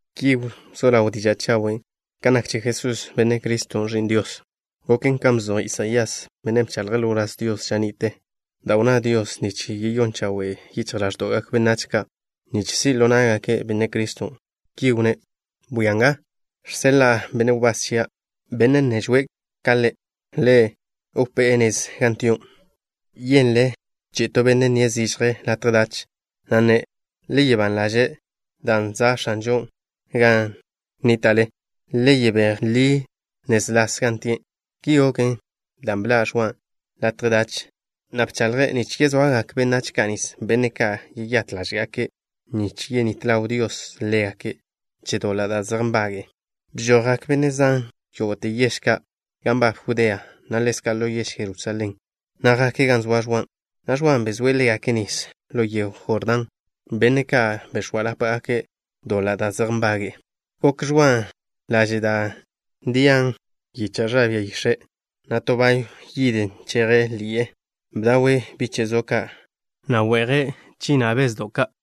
Ki wzó ḻaw diža' chawen' kan nak che Jesús, Benne' Criston', Ẕi'n Dios. Goken kan bzoj Isaías, bennen' bchaḻje' ḻo wláz Dios ža ni'te, da' wnná Dios nich yeyón chawen' yichj ḻáẕdo'gak benách ka' nich si' ḻo ná'gake' Benne' Criston'. Ki wnné': Bwia nga. Žseḻa'a benne' wbás chia', benne' nežwe' ka Le'. Ḻe' wpé'e nez gan tio'. Yenle chi'i to benne' nnie' zižje latje dach, na' nne': “Le soa ban ḻaže' dan' za' X̱anžon' gan nníta'le. Le yebéj ḻi nez las gan tie'.” Ki goken dan' bḻa' Ẕwa latje dach, na' bchaḻje' nich yezoagak benách ka' nis, benne' ka' yeyát ḻáže'gake' nich yenít ḻaw Dios ḻégake' che doḻa' da' zej nbage'e. Bžojgak benne' zan yógo'te yež ka' gan nbab Judea, na' ḻezka' ḻo yež Jerusalén, na' jake' gan zoa Ẕwan', na' Ẕwan' bezóe' ḻégake' nis ḻo yego Jordán, benne' ka' bex̱óalapgake' doḻa' da' zej nbage'e. Gokw Ẕwan' laže' dan' nžaben yicha' ẕa bia yix̱e', na' to bayw yid nžejen ḻi'e. Bdawe' biche' zo ka', na' we'je' bžina' che bezdo' ka'.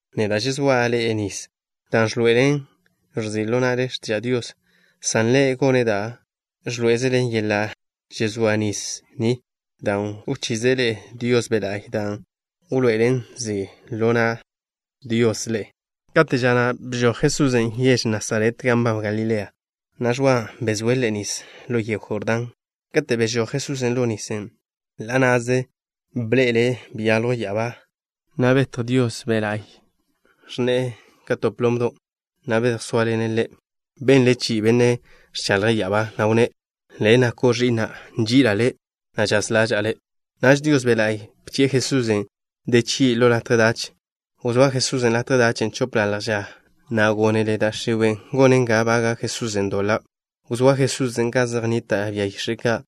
Neda' žezóa' ḻe'e nis, dan' ẕḻoe'elen nzi' ḻo na'le x̱tiža' Dios, san Ḻe' gone' da' ẕḻoé'ezele yeḻa' žezóa nis ni, dan' wchize' ḻe'e Dios Be' La'y, dan' wḻoe'elen nzi' ḻo na' Dios ḻe'e. Kate' ža na' bžoj Jesusen' yež Nasaret gan nbab Galilea, na' Ẕwan' bezóe' Ḻe' nis ḻo yego Jordán. Kate' bežój Jesusen' ḻo nisen', ḻa' na'ze bḻe'ele' beyaljw ya'abá, na' žetj Dios Be' La'y. Ẕnne'e ka to plomdo', na' bedjsóaḻene' Ḻe'. Benle chi'i Benne' ẕchaḻje' ya'abá, na' wnné': —Le' nako' Ẕi'na'. Nži'ila' Le', na' žaz ḻaža'a Le'. Naž Dios Be' La'y bchi'e Jesusen' de chgi' ḻo latje dach. Wzóa Jesusen' latje dachen' chopḻalj ža, na' gónele da' x̱iwe' gonen ga baga' Jesusen' doḻa'. Wzóa Jesusen' gan zej nnita' bia yix̱e' ka',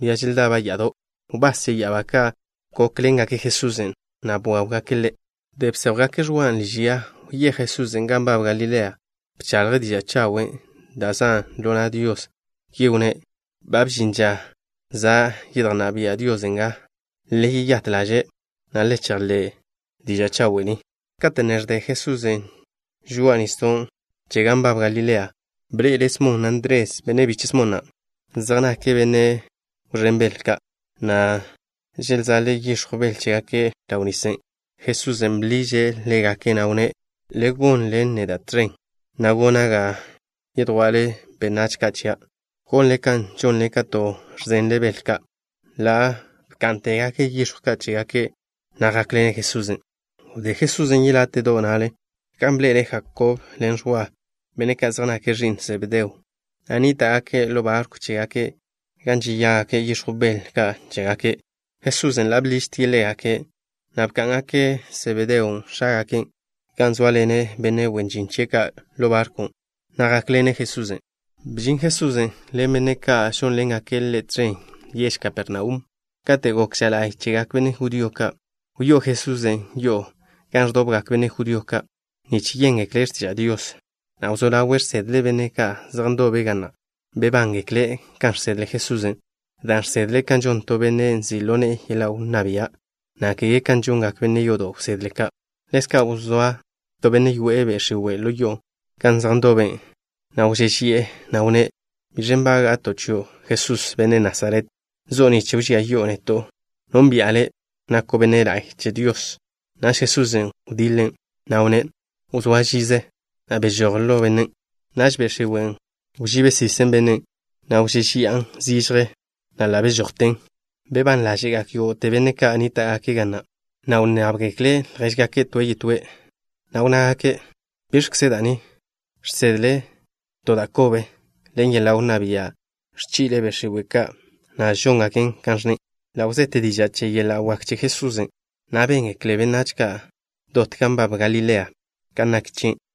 bia želdaba' ya'ado'. Wbás che ya'abá ka' gókḻengake' Jesusen', na' bwáwgake' Ḻe'. Wdé bséjwgake' Ẕwa liž ya, wyéj Jesusen' gan nbab Galilea. Bchaḻje' diža' chawen' dan' zan' ḻo na' Dios. Ki wnné': —Ba bžin ža. Za' yedjnná bia' Dios nga. Le yeyát ḻaže', na' le chejḻé' diža' chawe' ni. Kate' ne ẕde Jesusen' žoa'a nisdo' che gan nbab Galilea, bḻe'ele' Smon, na' Ndres, benne' biche' Smon na'. Zej nake' benne' wẕén bel ka', na' želzaḻe' yix̱jw bel chégake' ḻaw nisen'. Jesusen' bḻiže' ḻégake', na' wnné': —Le gonḻen neda' tẕen, na' gona' ga yedjwa'le benách ka' chia', gonle kan žonle kate' ẕzenle bel ka'. Ḻa' bká'ntegake' yix̱jw ka' chégake', na' jákḻene' Jesusen'. Wdé Jesusen' yeláte'do' na'le, gan bḻe'ele' Jakob ḻen Ẕwa, benne' ka' zej nake' ẕi'n Sebedeo, na' nníta'gake' ḻo barkw chégake' gan žeyágake' yix̱jw bel ka' chégake'. Jesusen' ḻa' bḻižtie' ḻégake', na' bká'ngake' Sebedeon', x̱ágake', gan zóaḻene' benne' wen žin chie' ka' ḻo barkwn', na' jákḻene' Jesusen'. Bžin Jesusen' ḻen benne' ka' žónḻengake' Ḻe' tẕen yež Kapernaum. Kate' gok ža la'y chegak benne' judío ka', wyó'o Jesusen' yo'o gan ẕdobgak benne' judío ka' nich yéngekle' x̱tiža' Dios, na' wzó ḻawe' žsedle' benne' ka' zej ndobe' ga na'. Bebángekle' kan žsedle Jesusen', dan' žsedle' kan žon to benne' nzi' ḻo ne'e yeḻa' wnná bia', na' kege kan žongak benne' yodo' wsedle ka'. Ḻezka' wzóa to benne' yoe'e be' x̱iwe' ḻo yo'o gan zej ndobe', na' wžéžeyi'e, na' wnné': —¿Biẕ nbága'to' chio', Jesús, benne' Nasaret? ¿Zo'o nich wžía yi'o neto'? Nónbi'a Le'. Nako' Benne' La'y che Dios. Naž Jesusen' wdiḻen', na' wnné': —Wzóa žize, na' bežój ḻo bennen'. Naž be' x̱iwen' wžibe sisen bennen', na' wžéžeya'an zižje, na' ḻa' bežojten. Bebán ḻáže'gak yógo'te benne' ka' nníta'gake' ga na', na' wnnábgekle' ljéžgake' toe' yetóe', na' wnnágake': —¿Biẕkze da' ni? ¿Žsedle' to da' kobe? Ḻen yeḻa' wnná bia' ẕchi'le' be' x̱iwe' ka', na' žóngaken kan ẕnne'. Ḻa' wzete diža' che yeḻa' wak che Jesusen', na' béngekle benách ka' dot gan nbab Galilean' kan nak chie'.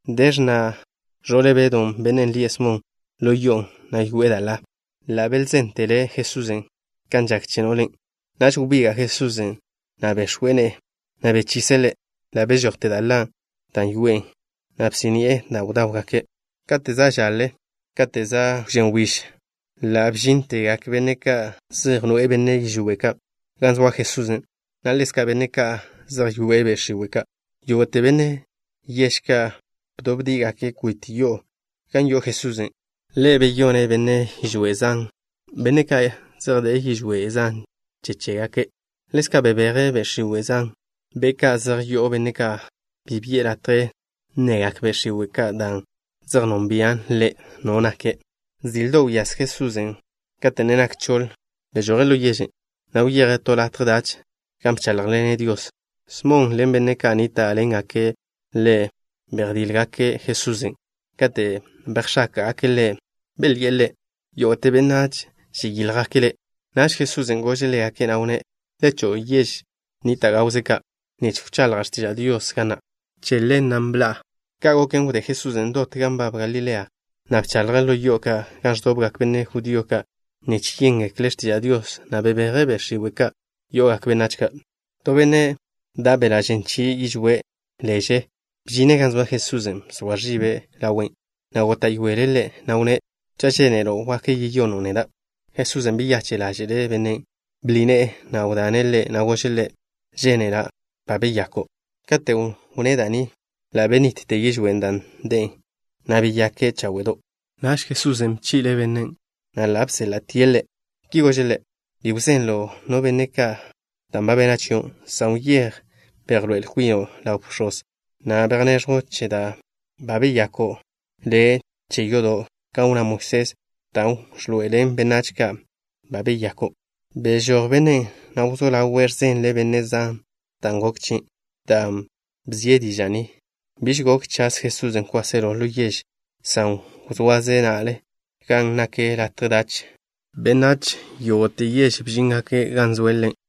De x̱na' ẕo'le Bedw, bennen' lie' Smon, ḻo yo'on', na' yoe'e da' ḻa. Ḻa' belzéntele' Jesusen' kan žak che no'len'. Naž wbiga' Jesusen', na' bex̱we' ne'e, na' bechise' ḻe'. Ḻa' bežojte da' ḻa da' yoe'en, na' bsí'ni'e da' bdáwgake'. Kate' za' žaḻe, kate' za' wžén wbíž, ḻa' bžíntegak benne' ka' zej noe'e benne' yižwé' ka' gan zoa Jesusen', na' ḻezka' benne' ka' zej yoe'e be' x̱iwe' ka'. Yógo'te benne' yež ka' bdóbdi'igake' kwit yo'o gan yo'o Jesusen'. Ḻe' beyone' benne' yižwé' zan, benne' ka' zej de'e yižwé' zan che chégake'. Ḻezka' bebeje' be' x̱iwe' zan, be' ka' zej yo'o benne' ka'. Bi bi'e latje nnegak be' x̱iwe' ka' dan' zej nonbian' Ḻe' No nake'. Zildo' wyase Jesusen', kate' ne nak choḻ. Bežoje' ḻo yežen', na' wyeje' to latje dach, gan bcháḻjḻene' Dios. Smon ḻen benne' ka' nníta'ḻengake' ḻe' bejdíljgake' Jesusen'. Kate' bejx̱áka'gake' Ḻe', belyi'e Ḻe': —Yógo'te benách žeyíljgake' Le'. Naž Jesusen' gože' ḻégake', na' wnné': —Le cho'o yež gawze ka', nich wchaḻja' x̱tiža' Dios ga na'. Che ḻen bežoja'. Ka' goken, wdé Jesusen' dot gan nbab Galilea, na' bchaḻje' ḻo yo'o ka' gan ẕdobgak benne' judío ka' nich yéngekle' x̱tiža' Dios, na' bebeje' be' x̱iwe' ka' yo'ogak benách ka'. To benne' da' beḻa' žen chie' yižwé' leže bžine' gan zoa Jesusen'. Bzoa ẕibe' ḻawe', na' góta'yoele' Ḻe', na' wnné': —Cha' žénelo', wak yeyono' neda'. Jesusen' beyache' ḻáže'le' bennen'. Bḻi ne'e, na' wdane' ḻe', na' gože' ḻe': —Žénela'. Ba beyako'. Katen' wnné' da' ni, ḻa' benitte yižwén' dan' de'e, na' beyake' cháwe'do'. Naž Jesusen' bchi'le' bennen', na' ḻa' beséḻa'tie' ḻe'. Ki gože' ḻe': —Bi wzenlo' no benne' kan bena' chio', san wyéj, bejḻoé'el kwino' ḻaw bx̱oz, na' bejneẕjw che da' beyako' le' che yodo' kan wnná Moisés, dan' wḻoe'elen benách ka' ba beyako'. Bežój bennen', na' wzó ḻawe' ẕzenle' benne' zan dan' goken chie'. Dan' bzie' diža' ni, biž gok chaz Jesusen' kwáselo ḻo yež, san wzoaze' na'le gan nak latje dach. Benách yógo'te yež bžíngake' gan zoe' Ḻe'.